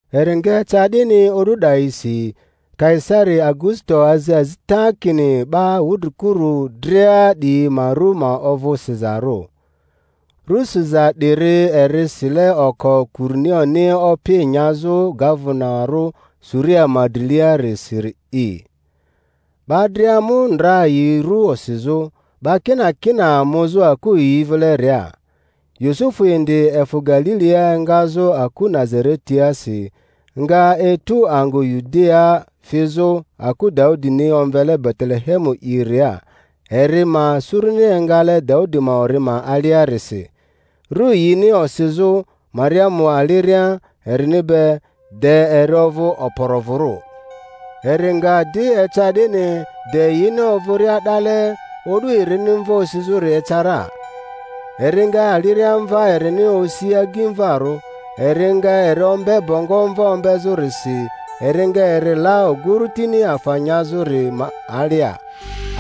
Eri nga eca 'dini o'du 'dayisi, Kaisari Augusito azi azita kini 'ba wudrikuru dria 'diyi ma ru ma ovᴜ sizarᴜ. Ru siza 'diri eri sile oko Kurinioni opi nyazᴜ gavenarᴜ Suria ma driliarisiri'i. 'Ba dria mu ndra yi ru osizᴜ, 'ba kinakina muzᴜ aku yi vileria. Yusufu indi efᴜ Galilia engazᴜ aku Nazaretiasi, nga etu angᴜ Yudiaa fizᴜ aku Daudini omvele Betelehemu'iria, eri ma suruni engale Daudi ma ori ma aliarisi, ru yini osizᴜ Mariamu aliria erini be, de eri ovᴜ okporovᴜrᴜ. Eri nga di eca 'dini, de yini ovᴜria 'dale o'du erini mva osizᴜri eca ra. Eri nga aliriamva erini osi agimvarᴜ, eri nga eri ombe bongo mva ombezᴜrisi, eri nga eri la oguru tini afa nyazᴜri ma alia,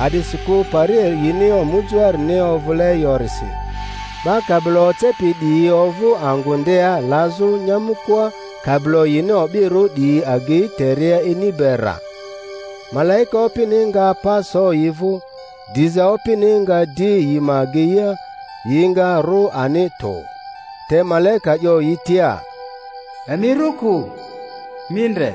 a'disikᴜ pari yini omujoarini ovᴜle yorisi. 'Ba kabilo ocepi 'diyi ovᴜ angᴜ ndea lazᴜ nyamᴜkoa, kabilo yini o'birᴜ 'diyi agei teria ini be rra. Malaika Opini nga pa so yi vᴜ, diza Opini nga di yi ma ageia, yi nga rᴜ ani tᴜ. Te malaika 'yo yi tia, Emi rᴜ kᴜ; mi ndre,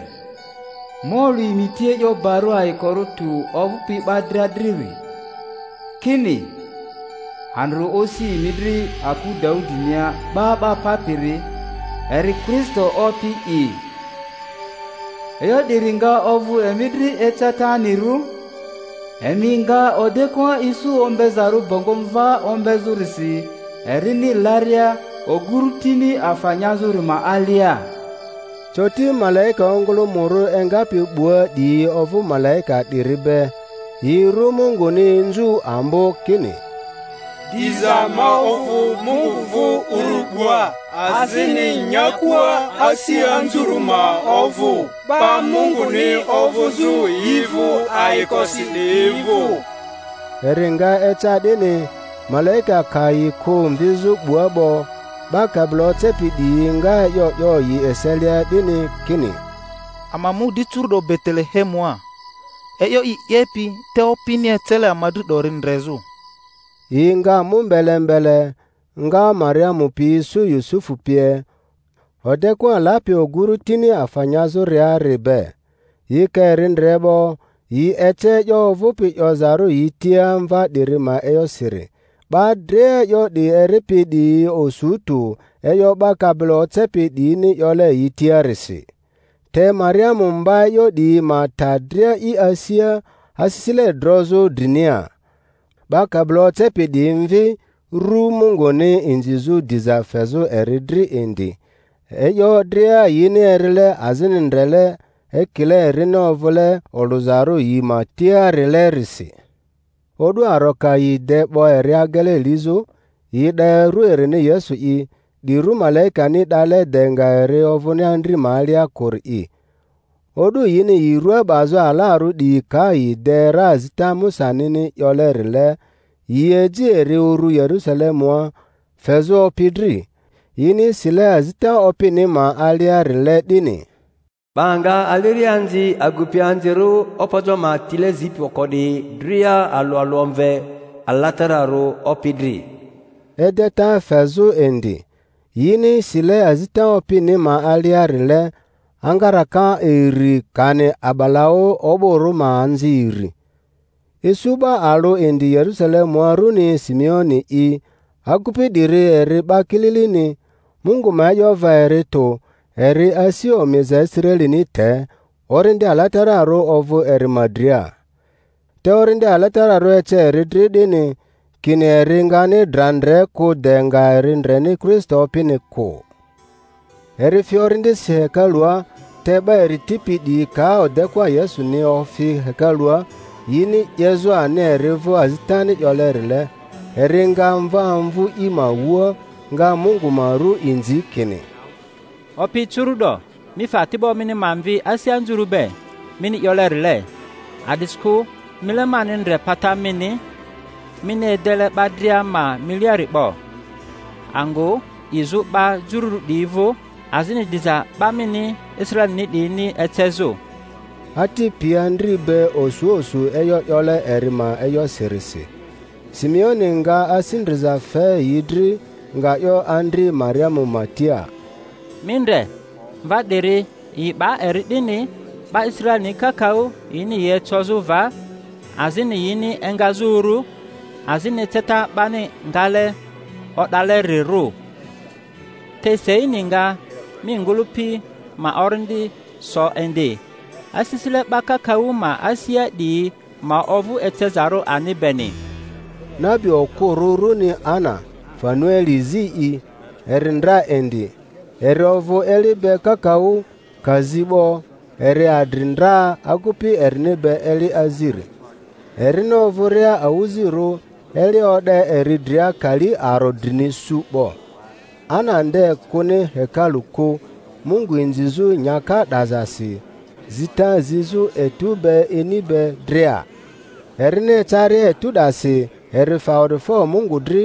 ma olᴜ emi tia e'yo barᴜ ayikorᴜ tᴜ ovᴜpi 'ba dria driri, kini, andrᴜ osi emi dri aku Daudinia 'Ba 'ba Papiri, eri Kristo Opi'i. E'yo 'diri nga ovᴜ emi dri ecetanirirᴜ: emi nga odekᴜa isu ombezarᴜ bongo mva ombezᴜrisi erini laria oguru tini afa nyazᴜri ma alia. Coti malaika ongᴜlᴜmᴜrᴜ engapi 'bua 'diyi ovᴜ malaika 'diri be, yi ru Munguni inzu ambo, kini, Diza ma ovᴜ Mungu vᴜ urᴜ 'bua, azini nyakua asi anzurᴜ ma ovᴜ 'ba Munguni ovᴜzᴜ yi vᴜ ayikosi 'diyi vᴜ. Eri nga eca 'dini, malaika ka yi kᴜ mvizᴜ 'bua 'bo, 'ba kabilo ocepi 'diyi nga e'yo 'yo yi eselia 'dini kini, Ama mu di curu'do Betelehemua, e'yo i 'yepi te Opini ecele ama dri 'dori ndrezᴜ. Yi nga mu mbele mbele, nga Mariamu pi isu Yusufu pie, odekᴜa lapi oguru tini afa nyazᴜriari be. Yi ka eri ndre 'bo, yi ece e'yo ovᴜpi 'yozarᴜ yi tia mva 'diri ma e'yosiri; 'ba dria e'yo 'di eripi 'diyi osu tᴜ e'yo 'ba kabilo ocepi 'diyini 'yole yi tiarisi. Te Mariamu mba e'yo 'diyi ma ta dria i asia, asisile drozᴜ drinia. 'Ba kabilo ocepi 'diyi mvi, ru Munguni inzizᴜ diza fezᴜ eri dri indi, e'yo dria yini erile azini ndrele, ekile erini ovᴜle olᴜzarᴜ yi ma tiarilerisi. O'du aro ka yi de 'bo eri agele lizᴜ, yi 'da ru erini Yesu'i, 'di ru malaikani 'dale de nga eri ovᴜni andri ma alia kᴜri'i. O'du yini yi rua 'bazᴜ alarᴜ 'diyi ka yi de ra azita Musanini 'yolerile, yi eji eri uru Yerusalemua, fezᴜ Opi dri (yini sile azita Opini ma aliarile 'dini, 'Ba nga aliriaanzi agupianzirᴜ opojo ma tile zipi oko 'diyi dria alᴜ alᴜ omve alatararᴜ Opi dri) edeta fezᴜ indi, yini sile azita Opini ma aliarile, angaraka iri kani a'balaᴜ o'bᴜrᴜ ma anzi iri. Isu 'ba alᴜ indi Yerusalemua runi Simeoni'i, agupi 'diri eri 'ba kililini, Mungu ma e'yo va eri tᴜ, eri asi omiza Israelini te; Orindi Alatararᴜ ovᴜ eri ma dria. Te Orindi Alatararᴜ ece eri dri 'dini, kini eri ngani dra ndre kᴜ de nga eri ndreni Kristo Opini kᴜ. Eri fi Orindisi hekalua; te 'ba eri tipi 'diyi ka odekᴜa Yesuni ofi hekalua, yini 'yezᴜ ani eri vᴜ azitani 'yolerile, eri nga mva amvu i ma wua, nga Mungu ma ru inzi kini, Opi, curu’do mi fe ati'bo mini ma mvi asi anzurᴜ be, mini 'yolerile; a'disikᴜ mile mani ndre pata mini mini edele 'ba dria ma miliari 'bo; angᴜ 'izᴜ 'ba jururᴜ 'diyi vᴜ, azini diza 'ba mini Israelini 'diyini ecezᴜ. Ati pi andri be osu osu e'yo 'yole eri ma e'yosirisi; Simeoni nga asi ndriza fe yi dri, nga 'yo andri Mariamu ma tia, Mi ndre, mva 'diri yi 'ba eri 'dini 'ba Israelini kakaᴜ yini yi ecozᴜ va, azini yini engazᴜ uru, azini eceta 'bani ngale o'dalerirᴜ; te seini nga mi ngᴜlᴜpi ma orindi so indi; asisile 'ba kakaᴜ ma asia 'diyi ma ovᴜ ecezarᴜ ani beni. Nabi okᴜrᴜ runi Ana, Fanueli zi'i, eri ndra indi (eri ovᴜ eli be kakaᴜ, ka zi 'bo eri adri ndra agupi erini be eli aziri, erini ovᴜria awᴜzirᴜ eli o'de eri dria kali aro drini su 'bo), Ana nde kᴜni hekalu kᴜ Mungu inzizᴜ nyaka 'dazasi, zita zizᴜ etu be ini be dria. Erini ecaria etᴜ 'dasi eri fe awa'difo Mungu dri,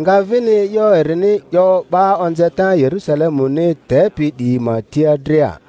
nga vini e'yo erini 'yo 'ba onzeta Yerusalemuni tepi 'diyi ma tia dria.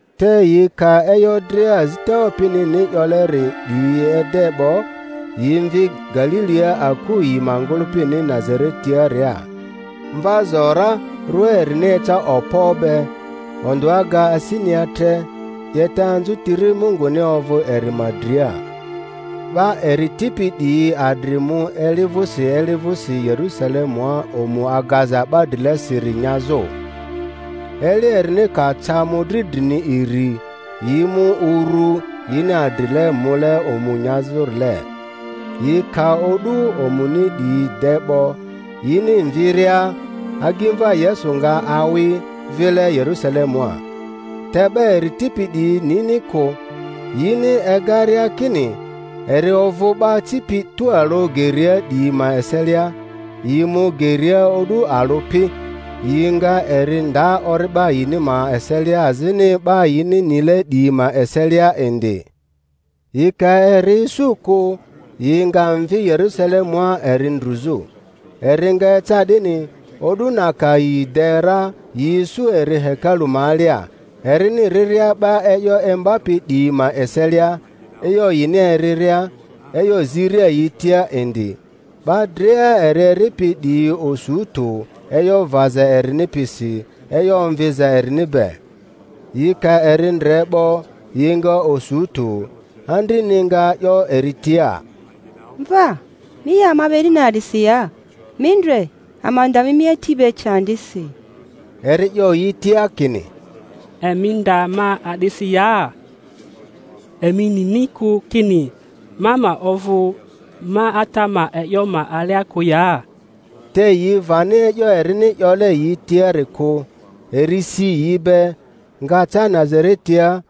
Te yi ka e'yo dria azita Opinini 'yolerile 'diyi ede 'bo, yi mvi Galilia aku yi ma ngᴜlᴜpini Nazaretaaria. Mva zo ra, rua erini eca okpo be, ondᴜa ga asinia tre; 'yeta anzᴜtiri Munguni ovᴜ eri ma dria. 'Ba eri tipi 'diyi adri mu eli vᴜsi eli vᴜsi Yerusalemua omu agaza 'ba drilesiri nyazᴜ. Eli erini ka ca mᴜdri drini iri, yi mu urᴜ yini adrile mule omu nyazᴜrile; yi ka o'du omuni 'diyi de 'bo, yini mviria, agimva Yesu nga awyi vile Yerusalemua. Te 'ba eri tipi 'diyi nini kᴜ; yini egaria kini eri ovᴜ 'ba acipi tualᴜ geria 'diyi ma eselia, yi mu geria o'du alᴜ pi, yi nga eri nda ori'ba yini ma eselia azini 'ba yini nile 'diyi ma eselia indi; yi ka eri isu kᴜ, yi nga mvi Yerusalemua eri ndruzᴜ. Eri nga eca 'dini, o'du na ka yi de ra yi isu eri hekalu ma alia, erini riria 'ba e'yo imbapi 'diyi ma eselia, e'yo yini eriria, e'yo ziria yi tia indi; 'ba dria eri eripi 'diyi osu tᴜ e'yo vaza erini pisi e'yo omviza erini be. Yi ka eri ndre 'bo, yi nga osu tᴜ; andrini nga 'yo eri tia, Mva, mi 'ye ama be 'dini a'disi ya? Mi ndre, ama nda mi mi ati be candisi. Eri 'yo yi tia kini, Emi nda ma a'disi ya? Emi nini kᴜ kini ma ma ovᴜ ma Ata ma e'yo ma alia kᴜ ya? Te yi vani e'yo erini 'yole yi tiari kᴜ. Eri si yi be, nga ca Nazaretia,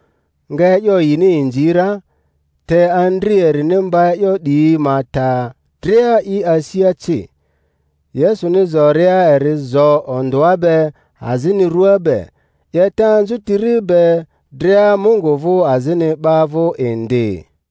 nga e'yo yini inzi ra; te andri erini mba e'yo 'diyi ma ta dria i asia ci. Yesuni zoria eri zo ondᴜa be azini rᴜa be, 'yeta anzutiri be dria Mungu vᴜ azini 'ba vᴜ indi.